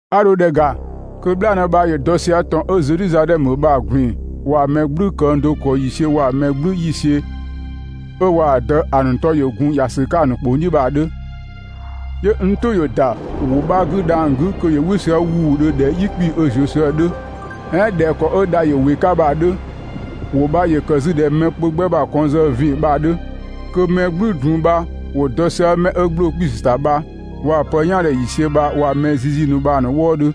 'A dho ‑dhɛ ‑ga kö "bhlaanë bha ‑yö dɔ sië ‑tɔn 'ö Zedhizadhɛmö bha‑ ꞊gbin‑ waa‑ mɛ "gblü këng do ‑kɔ ‑yiisiö waa‑ mɛ "gblü ‑yiisiö 'ö waa‑ Dë ‑a ‑nu 'tɔ ‑yö gun ‑ya ‑sü 'ka‑ ‑nu ‑kpong "dhiʋ̈ bha‑ ‑nu 'dhö. 'Yö n "tʋ ‑yö ‑da ‑wʋ 'bha 'gü dhang‑ 'gü kö ‑yö "wɩ sië ‑wuudhö ꞊dhɛ "yi 'kpii‑ 'ö ‑zuö sië‑ 'dhö, "ɛɛn ꞊dhɛ ‑kɔ 'ö dha ‑yö ‑wɩ 'ka bha‑ 'dhö. ‑Wʋ bha ‑yö ‑kë 'zü ꞊dhɛ mɛ kpö 'gbɛ ‑bha kɔnng zë ‑vin bha‑ 'dhö. Kö mɛ "gblü drun bha ‑wo dɔ sië 'mɛ 'ö ‑gbloo 'kpiisü ‑ta bha waa‑ pë "yaandhe ‑yiisiö bha waa‑ mɛ zizi ‑nu bha‑ ‑nu wëëdhö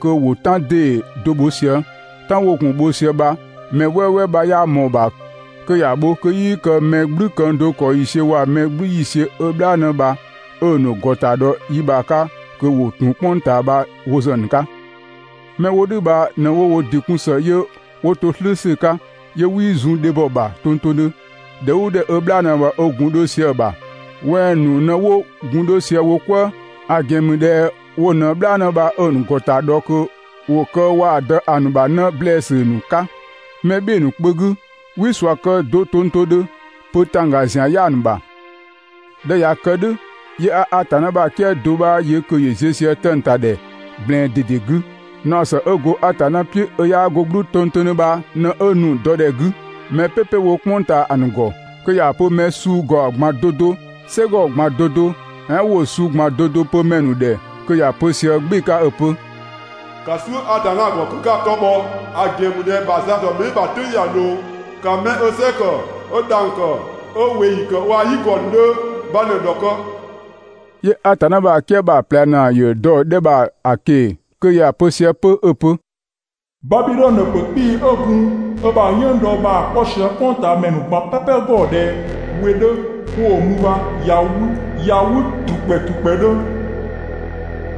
kö ‑wo "tan ‑dee do bho sië. "Tan 'wo gun‑ bho sië "dhʋ̈ bha mɛ "wɛɛwɛɛ 'bha 'yaa ꞊mɔɔ‑ ‑bha kö ‑ya bho kö 'yii kë mɛ "gblü këng do ‑kɔ ‑yiisiö waa‑ mɛ "gblü ‑yiisiö 'ö "bhlaanë bha 'ö‑ ‑nu ‑gɔta dhɔ yi 'bha 'ka kö ‑wo ‑tun "kpʋng ꞊taa bha wo ‑zë ‑a ‑nu 'ka. 'Mɛ 'wo "dhʋ̈ bha ꞊në 'wo wo ‑dɩ kun ‑së 'yö 'wo to "slʋ̈ʋ̈slʋ̈ 'ka, 'yö 'wii zun dhebhɔ ‑bha tongtongdhö. ‑Dhɛ "ʋʋ ‑dhɛ 'ö "bhlaanë bha 'ö gun 'dho sië‑ ‑bha wɛng‑ ‑nu ꞊në 'wo gun 'dho sië wo "kwëë, ‑a ‑gɛn ‑mü ꞊dhɛ wo ꞊në "bhlaanë bha 'ö‑ ‑nu ‑gɔta dhɔ kö ‑wo kë waa‑ Dë ‑a ‑nu ‑bha 'në ‑blɛɛsü ‑nu 'ka mɛ "bhɩɩ‑ ‑nu kpö 'gü. 'Wii ꞊sua kë do tongtongdhö, pö ‑tangga ‑zian 'yaa‑ ‑nu ‑bha. ꞊Dhɛ 'ö ꞊ya kë "dhʋ̈, 'yö 'a Atanna ‑bha "kië do 'bha yö kö ‑yö ziö sië 'tëng‑ ‑ta ‑dhɛ ꞊gblɛɛn ꞊dede 'gü. Naɔ ‑së 'ö go Atanna "piʋ̈ 'ö 'yaa 'go "gblʋʋ tongtongdhö bha ꞊në 'ö nu‑ dɔ ‑dhɛ 'gü, mɛ "pɛpɛ 'wo "kpʋng ꞊taa ‑a ‑nu ‑gɔ, kö ‑ya pö mɛ suu ‑gaɔ ꞊gban 'do 'do, "sɛgɔ ꞊gban 'do 'do "ɛɛn ‑wʋ suu ꞊gban 'do 'do pö ‑mɛ ‑nu ‑dhɛ kö ‑ya pö sië "gbɩɩ‑ 'ka 'ö‑ pö: «‑Ka "suʋ̈ Atanna ‑gɔ kö 'ka‑ 'tɔ bhɔ! ‑A ‑gɛn ‑mü ꞊dhɛ ‑a ‑bha za ‑dɔ mɛ "bhɩɩ‑ ‑bha "tʋ̈ng ꞊ya ꞊loo. ‑Ka 'mɛ ö "sɛ ‑kë 'ö dhang‑ ‑kë, 'ö ꞊weeyi ‑kë waa‑ "yigɔ ‑nu 'dhö bha ꞊në‑ ‑dhɔkë!» 'Yö Atanna ‑bha "kië bha‑ ꞊plɛ ‑naa ‑yö dɔ‑ 'dhɛ bha‑ ꞊keng‑ kö ‑ya pö sië 'pö 'ö‑ pö: «Babidhɔnö ‑pö 'kpii‑ 'ö gun ö ‑bha "yënngdɔ bha‑ 'kpɔ sië "kpʋngtaamɛ ‑nu ꞊gban "pɛpɛ ‑gɔ ꞊dhɛ we 'dhö 'wo‑ mü bha ꞊ya 'wü, ꞊ya 'wü ‑trukpɛ ‑trukpɛdhö.»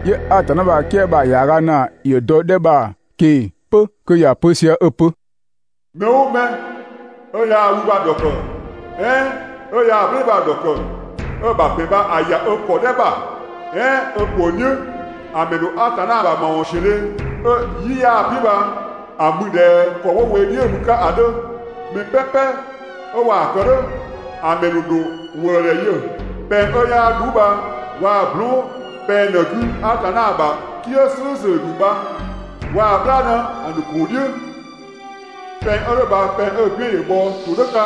'Yö Atanna ‑bha "kië bha‑ ‑yaaga ‑naa ‑yö dɔ‑ 'dhɛ bha‑ ꞊keng‑ 'pö kö ‑ya pö sië 'ö‑ pö: «Mɛ "ʋʋ mɛ 'ö yaa‑ wü bha‑ ‑dhɔkë "ɛɛn 'ö yaa‑ "blɛɛn‑ bha‑ ‑dhɔkë, 'ö‑ ‑bha ‑bɛn bha‑ ‑ya ö ‑kɔdhɛ ‑bha, "ɛɛn ö ‑kpong "dhiʋ̈, ‑a ‑mɛ ‑dho Atanna ‑bha ‑mawɔnsiödhe 'ö "yi 'yaa‑ "piʋ̈ bha‑ mü ꞊dhɛ ‑kɔ 'wo we "dhiʋ̈‑ mü‑ 'ka bha‑ 'dhö. Mɛ "pɛpɛ 'ö waa‑ ‑kë "dhʋ̈, ‑a ‑mɛ ‑nu ‑dho ‑wëëdhɛ yö pɛng 'ö 'yaa "dhuu bha waa‑ blɔɔn" pɛng ꞊në‑ 'gü Atanna ‑bha "kië "slʋ̈ʋ̈slʋ̈ ‑nu bha waa‑ "bhlaanë ‑a ‑nu ‑kuu "dhiʋ̈. Pɛng 'ö "dhʋ̈ bha pɛng 'ö‑ "gbiën ‑yö bhɔ ‑todhʋ̈ 'ka,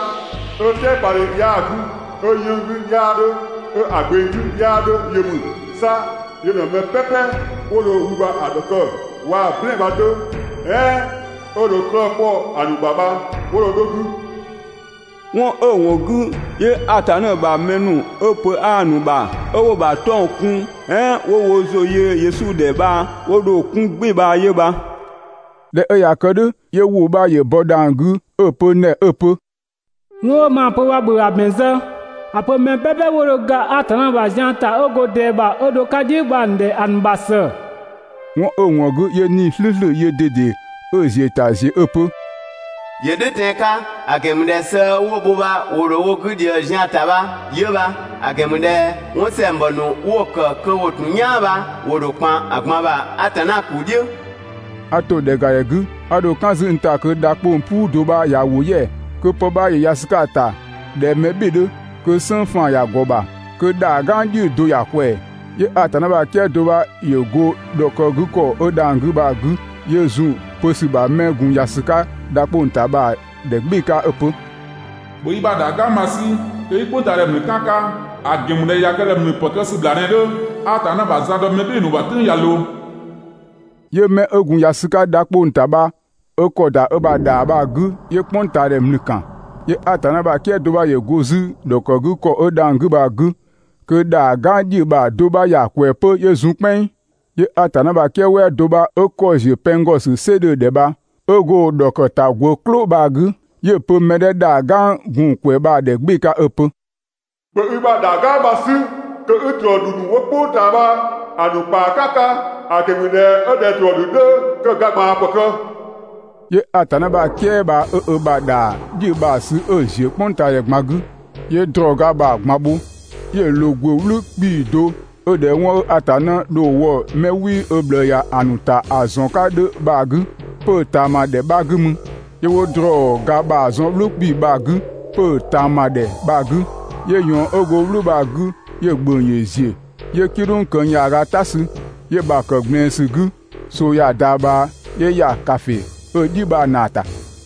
'ö "tɛɛpadhe 'yaa‑ 'gü, 'ö‑ 'yënng‑ 'gü 'yaa 'dhö 'ö‑ gbeng 'gü 'yaa 'dhö yö ‑mü. 'Sa yö ꞊në mɛ "pɛpɛ 'wo dho wü bha‑ ‑dhɔkë waa‑ "blɛɛn‑ bha‑ 'dhö, "ɛɛn 'ö dho 'klëë‑ 'kpɔ‑ ‑nu ‑bha bha wo dho 'dho‑ 'gü. 'Wɔn 'ö‑ ‑wɔn 'gü 'yö Atanna ‑bha mɛ ‑nu 'ö pö 'aa‑ ‑nu ‑bha, 'ö 'wo‑ ‑bha 'tɔng‑ kun "ɛɛn 'wo ‑zʋ yö Yesu ‑dhɛ bha 'wo dho‑ 'kun "gbɩɩ‑ bha 'yö bha. ꞊Dhɛ 'ö ꞊ya kë "dhʋ̈, 'yö ‑wʋ 'bha ‑yö bɔ dhang‑ 'gü 'ö‑ pö n ‑dhɛ 'ö‑ pö: «'Wɔn 'ö maa‑ pö bha ‑bhö ‑a ‑bɛn zë! ‑A pö mɛ "pɛpɛ 'wo dho ga Atanna ‑bha zian ‑ta 'ö go ꞊dɛɛ bha 'ö dho‑ 'ka "dhiʋ̈ bha‑ ‑nu ‑dhɛ ‑a ‑nu ‑bha ‑së! 'Wɔn 'ö‑ ‑wɔn 'gü 'yö 'Nii‑ "slʋ̈ʋ̈slʋ̈ yöö ꞊dede 'ö‑ ‑ziö ‑ta ‑ziö 'ö‑ pö: «‑Yö "dhʋ̈ tɛan‑ 'ka, ‑a ‑gɛn ‑mü ꞊dhɛ sëë 'wo‑ bho bha ‑wo ‑dho wo 'gü ꞊dhië‑ zian‑ ‑ta bha 'yö bha. ‑A ‑gɛn ‑mü ꞊dhɛ 'wɔn ‑sɛngbɔ ‑nu 'wo‑ ‑kë kö ‑wo ‑tun "yaan bha ‑wo ‑dho ‑kpan ꞊gban ‑bha Atanna ‑kuu "dhiʋ̈.» A ‑to ‑dhɛgadhɛ 'gü, 'a dho "kan 'zü n ‑ta kö dha 'kpong‑ "puu do 'bha ꞊ya ‑wo "yɛa‑, kö pë 'bha ‑yö ‑ya ‑sü 'ka‑ ‑ta ꞊dhɛ mɛ "bhɩɩ‑ 'dhö. Kö "sënng faan‑ ‑ya ‑gɔ ‑bha, kö ‑dhaa "gang "dhiʋ̈‑ do ‑ya ꞊kwɛɛ‑. 'Yö Atanna ‑bha "kië do 'bha ‑yö go‑ ‑dhɔkëgükɔ 'ö dhang‑ 'gü bha‑ 'gü 'yö zun‑ pö ‑sü bha 'mɛ 'ö gun ‑ya ‑sü 'ka dha 'kpong‑ ‑ta bha‑ ‑dhɛ "gbɩɩ‑ 'ka 'ö‑ pö: «‑Bhö i ‑bha ‑dhaa "gang bha‑ 'sü kö 'i "kpʋngtaadhɛ ‑mlü "kan‑ 'ka, ‑a ‑gɛn ‑mü ꞊dhɛ ꞊ya kë ꞊dhɛ ‑mlü ‑pë kë ‑sü ‑bhlaa ꞊në‑ 'dhö, Atanna ‑bha za dɔ mɛ "bhɩɩ‑ ‑nu ‑bha "tʋ̈ng ꞊ya ꞊loo.» 'Yö 'mɛ 'ö gun ‑ya ‑sü 'ka dha 'kpong‑ ‑ta bha 'ö ‑kɔ ‑da ö ‑bha ‑dhaa bha‑ 'gü, 'yö "kpʋngtaadhɛ ‑mlü ‑kan. 'Yö Atanna ‑bha "kië do 'bha ‑yö go 'zü‑ ‑dhɔkëgükɔ 'ö dhang‑ 'gü bha‑ 'gü kö ‑dhaa "gang "dhiʋ̈‑ bha‑ do 'bha ꞊ya ꞊kwɛɛ‑ 'pö 'yö zun "kpɛnng. 'Yö Atanna ‑bha "kië "wɛɛ do 'bha 'ö ‑kɔ ‑ziö pɛng ‑gɔ ‑sü "sɩ 'dhö‑ ‑dhɛ bha 'ö go‑ ‑dhɔkëtagwë "klʋ bha‑ 'gü, 'yö‑ pö mɛ 'dhɛ ‑dhaa "gang gun‑ ꞊kwɛɛ‑ bha‑ ‑dhɛ "gbɩɩ‑ 'ka 'ö‑ pö: «‑Bhö i ‑bha ‑dhaa "gang bha‑ 'sü kö 'i ‑drɔɔ ‑dhü ‑nu 'wo "kpʋng ꞊taa bha‑ ‑nu ‑kpaa "kan‑ 'ka, ‑a ‑gɛn ‑mü ꞊dhɛ 'ö ꞊dhɛ ‑drɔɔ ‑dhü 'dhö kö‑ ga ꞊gbaan ‑pë kë. 'Yö Atanna ‑bha "kië bha 'ö ö ‑bha ‑dhaa "dhiʋ̈‑ bha‑ sü 'ö‑ ‑ziö "kpʋngtaadhɛ ꞊gban 'gü, 'yö ‑drɔɔ ga bha‑ ꞊gban bho, 'yö‑ ꞊loo ‑gwë "wlʋ̈ 'kpii‑ do 'ö ꞊dhɛ 'wɔn 'ö Atanna dho‑ wɔ ('mɛ 'wii ö ꞊bhlëë ‑ya) ‑nu ‑ta ‑a ‑zɔn 'ka 'dhö bha‑ 'gü, 'pö‑ ꞊taama ‑dhɛ 'bha 'gü mü. 'Yö 'wo ‑drɔɔ ga bha‑ zɔn "wlʋ̈ 'kpii‑ bha‑ 'gü 'pö‑ ꞊taama ‑dhɛ bha‑ 'gü, 'yö ꞊yɔɔn 'ö go "wlʋ̈ bha‑ 'gü 'yö‑ ‑gböng ‑yö ‑ziö 'yö "kidhʋng këng ‑yaaga "ta sü, 'yö‑ ‑bha ‑kë ꞊gblɛɛn ‑sü 'gü, ꞊soo ꞊ya ‑da ꞊bhaa 'yö ‑ya ‑kafe 'ö‑ "dhi bha‑ ‑naa ‑ta.